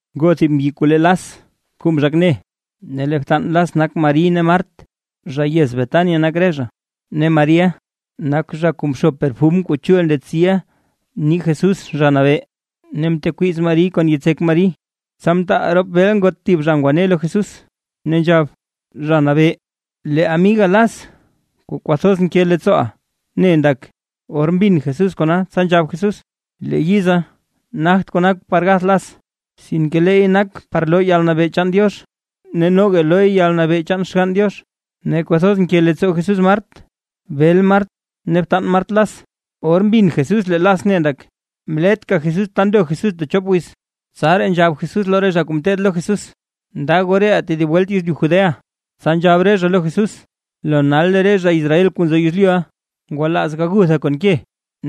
Ngoo thib mbyi kuu le Las kuu mzhak ne, ne btan Las nak Mari ne Mart, zha yez Betania nak re zha. Ne Mariʼa, nak zha mxo perfum kuu chul ndetsi nii Jesús Zha Nabee, ne mtekwiiz Mariy kon yitsek Mari. Tsa mtaal rop bel ngot thib zha ngwa ngwane lo Jesús ne nzhab: ―Zha Nabee, lee amiga Las kuu kwathoz nke leettsooʼa ne ndak. Or mbin Jesús kona, tsa nzhab Jesús: ―Lee yiza nagt kona par gath Las, sinke leey nak par loo yalnabee chaan Diox, ne noga looy yalnabee chaan Xgann Diox. Ne kwathoz nke leettsoo Jesús Mart, bel Mart ne btan Mart Las, or mbin Jesús lee Las ne ndak, mletka Jesús ta ndo Jesús techop wiz. Tsaraa nzhab Jesús lo re zha kuu ngeteed lo Jesús: ―Nda goo reʼaa tedib welt yezlyu Judea. Tsa nzhab re zha lo Jesús: ―Lo nal lee re zha Israel kuu nzo yezlyuʼa, ngwalaaz gagutha kon ke,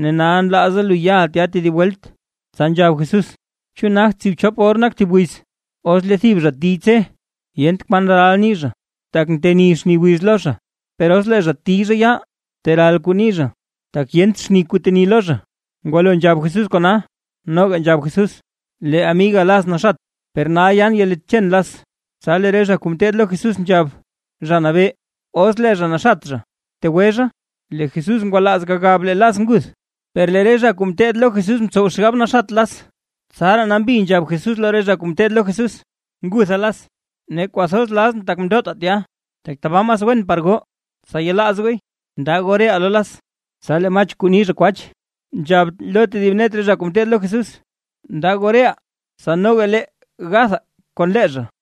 ne nal nlaaza lu yaʼa tya tedib welt. Tsa nzhab Jesús: ―¿Chu nagt tsiibchop or nak thib wiz? Os lee thib zha tiy zha tse, yent kwan ral nii zha, tak nteni xni wiz lo zha, per os lee zha tiy zha yaal, teral kuu nii zha, tak yent xni kuu teni lo zha. Ngwalo nzhab Jesús kona, noga nzhab Jesús: ―Lee amigaa Las naxat, per nal yan yalitchen Las. Tsa lee re zha kuu ngeteed lo Jesús nzhab: ―Zha Nabee, os lee zha naxat zha, tegwe zha. Lee Jesús ngwalaaz gagab lee Las nguth, per lee re zha kuu ngeteed lo Jesús mtsow xgab naxat Las. Tsaraa nambi nzhab Jesús lo re zha kuu ngeteed lo Jesús: ―Ngutha Las. Ne kwathoz lazʼn tak mndotaa tya, tak tabaa mas wen par goo, tsa yelaaz gooy. Nda goo reʼaa lo Las. Tsa lee Mach kuu ni zha “kwach”, nzhab lo tedib net re zha kuu ngeteed lo Jesús: ―Nda goo reʼaa, tsa noga lee gathaa kon lee zha.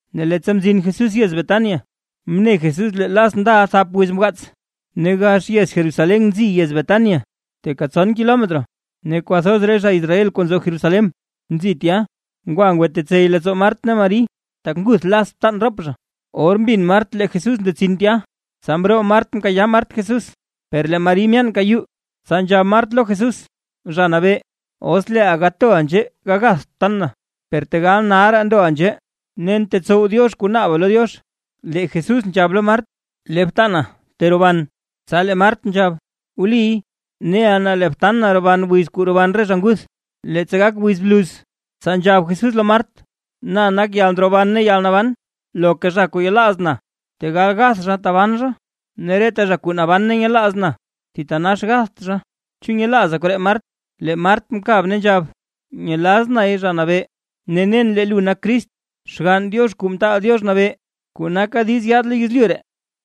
Ne leettsa mzin Jesús yez Betania, mne Jesús lee Las ndaʼa thap wiz mgaats. Ne gax yez Jerusalén nzi yez Betania, teeka tson kilometro. Ne kwathoz re zha Israel kuu nzo Jerusalén nzi tya, ngwa ngwatetsey leettsoo Mart ne Mari, tak nguth Las btan rop zha. Or mbin Mart lee Jesús ndetsin tya, tsa mroo Mart mkayaa Mart Jesús, per lee Mari myaanka yuu. Tsa nzhab Mart lo Jesús: ―Zha Nabee, os leeʼa gatoʼa nzhee gagatht btan na. Per tegal nalraa ndoʼa nzhee, nen tetsow Diox kuu naaba lo Diox. Lee Jesús nzhab lo Mart: ―Lee btana teroban. Tsa lee Mart nzhab: ―Wliy, neʼa na lee btan na roban wiz kuu roban re zha nguth, leettsa gak wiz bluz. Tsa nzhab Jesús lo Mart: ―Na nak yalndroban ne yalnaban. Loka zha kuu yelaaz na, tegal gath zha taban zha, ne reta zha kuu naban ne nyelaaz na, thitanax gatht zha. ¿Chu nyelaaza koree Mart? Lee Mart mkab ne nzhab: ―Nyelaz nay Zha Nabee. Ne, nen lee Lu Nak Crist, Xgann Diox Kuu Mtaal Diox Nabee, kuu naka diiz yaad lo yezlyu ree.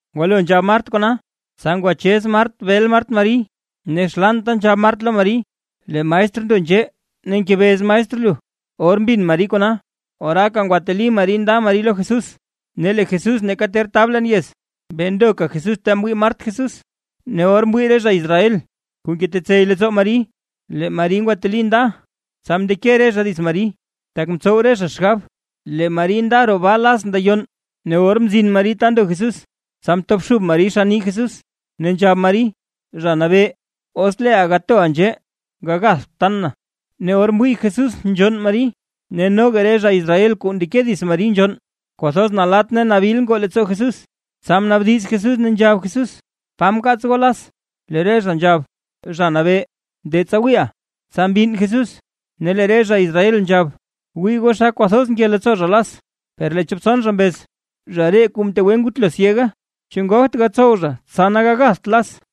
Ngwalo nzhab Mart kona, tsa ngwachez Mart bel Mart Mari, ne xlaanta nzhab Mart lo Mari: ―Lee maestr ndo nzhee ne ngebez maestr lu. Or mbin Mari kona, oraaka ngwateli Mari nda Mari lo Jesús. Ne lee Jesús neeka ter tab leen yez, bee ndoka Jesús ta mwii Mart Jesús. Ne or mwii re zha Israel kuu ngetetsey leettsoo Mari, lee Mari ngwateli nda, tsa mndeke re zha dits Mari, tak mtsow re zha xgab lee Mari nda roo baa Las ndayonn. Ne or mzin Mari ta ndo Jesús, tsa mtobxub Mari xann nii Jesús, ne nzhab Mari: ―Zha Nabee, os leeʼa gatoʼa nzhee, gagatht btan na. Ne or mwii Jesús nzhonn Mari ne noga re zha Israel kuu ndeke dits Mari nzhonn, kwathoz nalatt ne nabil ngoo leettsoo Jesús, tsa mnaabdiz Jesús ne nzhab Jesús: ―¿Pa mkaats goo Las? Lee re zha nzhab: ―Zha Nabee, de tsa wiiʼa. Tsa mbinn Jesús. Ne lee re zha Israel nzhab: ―¡Wii goo xa kwathoz mke leettsoo zha Las! Per lee chop tson zha mbez: ―Zha ree kuu mtegwe ngutlo syega; ne ¿chu ngogt gatsow zha tsa na gagatht Las?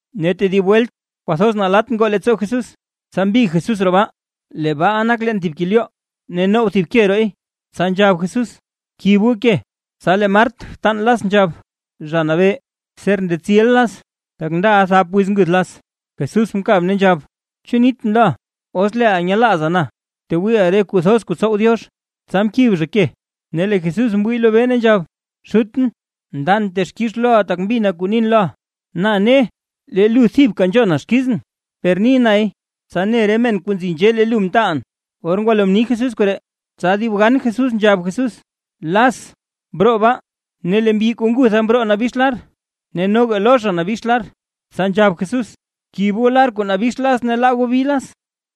Ne tedib welt kwathoz nalatt ngoo leettsoo Jesús, tsa mbig Jesús roo baa. Lee baaʼa nak leen thib kelyoo, ne now thib ke rooy. Tsa nzhab Jesús: ―Kib goo ke. Tsa lee Mart, btan Las nzhab: ―Zha Nabee, ser ndetsiʼa Las, tak ndaʼa thap wiz nguth Las. Jesús mkab ne nzhab: ―¿Chu nitʼn loʼa, os leeʼa nyelaaza na, tewiiʼa re kuu thoz kuu tsow Diox? Tsa mkib zha ke. Ne lee Jesús mwii lobee ne nzhab: ―Xutʼn, ndan texkix loʼa tak mbina kuu nin loʼa. Na ne, lee lu thibka nzhona xkizʼn, per ni nay tsa ne re men kuu nzi nzhee lee lu mtaalʼn. Or ngwalo mni Jesús koree, tsa dib gan Jesús nzhab Jesús: ―¡Las broo baa! Ne lee mbyi kuu ngutha mroo nabix lar, ne noga lo zha nabix lar, tsa nzhab Jesús: ―Bkib goo lar kuu nabix Las ne laa goo bi Las.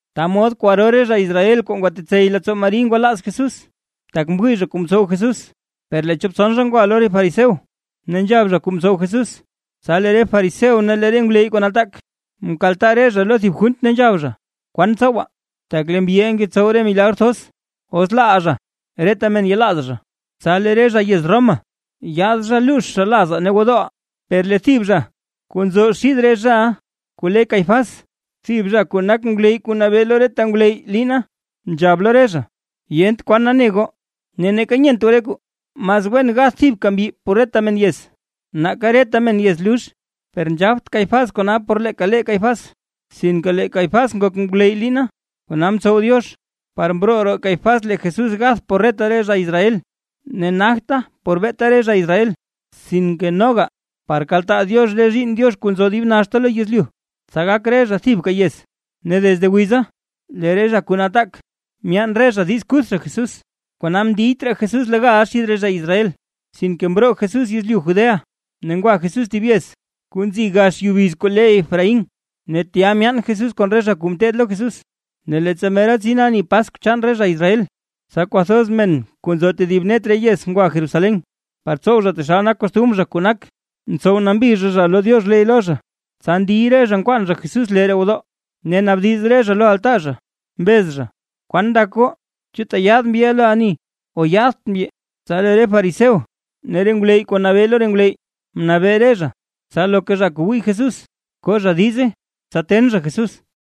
Ta mod kwaro re zha Israel kuu ngwatetsey leettsoo Mari ngwalaaz Jesús, tak mwii zha kuu mtsow Jesús. Per lee chop tson zha ngwa lo re fariseo, ne nzhab zha kuu mtsow Jesús. Tsa lee re fariseo ne re ngwleyy kuu nataak, mkaltaa re zha lo thib junt ne nzhab zha: ―¿Kwan tsowaa? Tak lee mbyiʼa ngetsow re milagr thoz. Os laaʼaa zha, reta men yelaaz zha, tsa lee re zha yez Roma yaad zha ne luux zha lazaa ne gwodooʼaa. Per lee thib zha kuu nzo xid re zhaʼa kuu le Caifás, thib zha kuu nak ngwleyy kuu nabee lo reta ngwleyy liina, nzhab lo re zha: ―¡Yent kwan nane goo! Ne neeka nyent goo re kwaa, mas wen gath thibka mbyi por reta men yez, nake reta men yez lux. Per nzhabt Caifás kona por leeka lee Caifás, sinke lee Caifás nak ngwleyy liina, kona mtsow Diox, par mroo roo Caifás lee Jesús gath por reta zha Israel, ne nagte beeta por re zha Israel, sinke noga par kaltaa Diox re zhiinn Diox kuu nzo dib naxta lo yezlyu, tsa gak re zha thibka yez. Ne desde wiza lee re zha kuu nataak myaan re zha diiz kuth zha Jesús. Kona mndiyt raa Jesús legal xid re zha Israel, sinke mroo Jesús yezlyu Judea, ne ngwa Jesús thib yez kuu nzi gax yubiz kuu le Efraín, ne tya myaan Jesús kon re zha kuu ngeteed lo Jesús. Ne leettsa mera tsin ani Paskw chaan re Israel, tsa kwathoz men kuu nzo tedib net re yez ngwa Jerusalén, par tsow zha taxal nak kostumr zha kuu nak, ntsow nambi zha zha lo Diox ley lo zha. Tsa ndiy re zha nkwaan zha Jesús lee roo gwodoo, ne naabdiz re zha lo altaa zha, mbez zha: ―¿Kwan ndak goo? ¿Chu tyaad mbyiʼa lo ani o yaadt mbyi? Tsa lee re fariseo ne re ngwleyy kuu nabee lo re ngwleyy mnabee re zha, tsa loka zha kuu wii Jesús, ko zha diize, tsa ten zha Jesús.